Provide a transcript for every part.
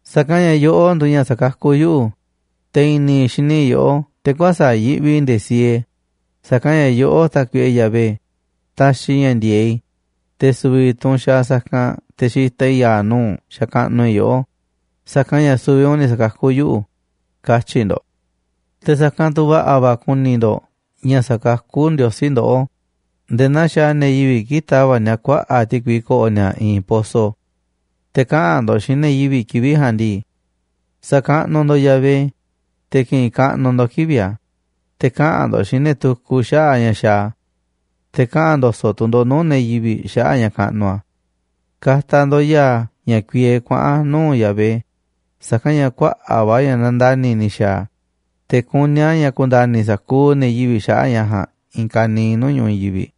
Sa̱kanꞌ ña̱ yoꞌó nduuꞌ ña̱ sa̱kakú yuꞌu̱, te̱ i̱ni̱ i̱ xini yoꞌó, te̱ kuäsa̱ꞌ yiꞌvi nde̱e̱ siee, sa̱kanꞌ ña̱ yoꞌó, Tákuiꞌe Yahvé, taxiꞌ ña̱ ndi̱e̱eꞌ i̱, te̱ su̱vi̱ tu̱ u̱nꞌ xaaꞌ sa̱kanꞌ te̱ xitaꞌ i̱ ya̱a̱ nuu̱ꞌ u̱nꞌ xakaꞌnuꞌ i̱ yoꞌó, sa̱kanꞌ ña̱ su̱vi̱ u̱nꞌ ni̱ sa̱kakú yuꞌu̱”, katyi̱ ndo̱ꞌ. Te̱ sa̱kanꞌ tu̱ va̱ꞌa̱ va̱ ku̱ni̱ ndo̱ꞌ ña̱ sa̱kakú Ndiosí ndoꞌó nde̱e̱ naa xaaꞌ ne̱ yivi̱ꞌ kii̱ꞌ tava̱ꞌ ni̱a̱ kuaꞌa̱ꞌ ti̱kui ko̱ꞌo̱ ni̱a̱ i̱i̱n poso. Te̱ kaꞌa̱n ndo̱ꞌ xiinꞌ ne̱ yivi̱ꞌ kivi̱ꞌ ja̱a̱nꞌ ndii: “Sa̱kaꞌnuꞌ ndo̱ꞌ Yahvé, te̱ ki̱ꞌi̱n kaꞌnuꞌ ndo̱ꞌ kivi̱ꞌ a̱, te̱ kaꞌa̱n ndo̱ꞌ xiinꞌ ne̱ tukuꞌ xaꞌa̱ꞌ ña̱ xaaꞌ a̱, te̱ kaꞌa̱n ndo̱so̱ꞌ tu̱ ndo̱ꞌ nuu̱ꞌ ne̱ yivi̱ꞌ xaꞌa̱ꞌ ña̱ kaꞌnuꞌ a̱. Ka̱ta̱ ndo̱ꞌ ya̱a̱ ña̱ kuiee kuaꞌa̱n nuu̱ꞌ Yahvé, sa̱kanꞌ ña̱ kuaꞌa̱ꞌ va̱ ña̱ nandani̱ ni̱ xa̱a̱ a̱, te̱ kuní a̱ ña̱ ku̱nda̱ni̱ sa̱kuuꞌ ne̱ yivi̱ꞌ xaꞌa̱ꞌ ña̱ ja̱a̱nꞌ i̱i̱n kaniiꞌ nuu̱ꞌ ñu̱ꞌuꞌ i̱i̱n yivi̱ꞌ.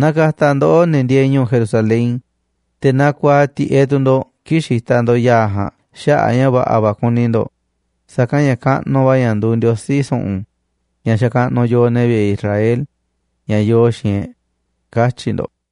Na ka̱ta̱ ndoꞌó, ne̱ ndieeꞌ ñu̱u̱ Jerusalén, te̱ na ku̱a̱aꞌ tiꞌeꞌ tu̱ ndo̱ꞌ kii̱ꞌ xitaꞌ ndo̱ꞌ ya̱a̱ ja̱a̱nꞌ xaꞌa̱ꞌ a̱ ña̱ va̱ꞌa̱ va̱ kuni ndo̱ꞌ, sa̱kanꞌ ña̱ kaꞌnuꞌ va̱ ña̱ nduuꞌ Ndiosí su̱ꞌu̱n, ña̱ xakaꞌnuꞌ yooꞌ, ne̱ vi̱ꞌe̱ Israel, ña̱ yoo xiinꞌ e̱ꞌ”, katyi̱ ndo̱ꞌ.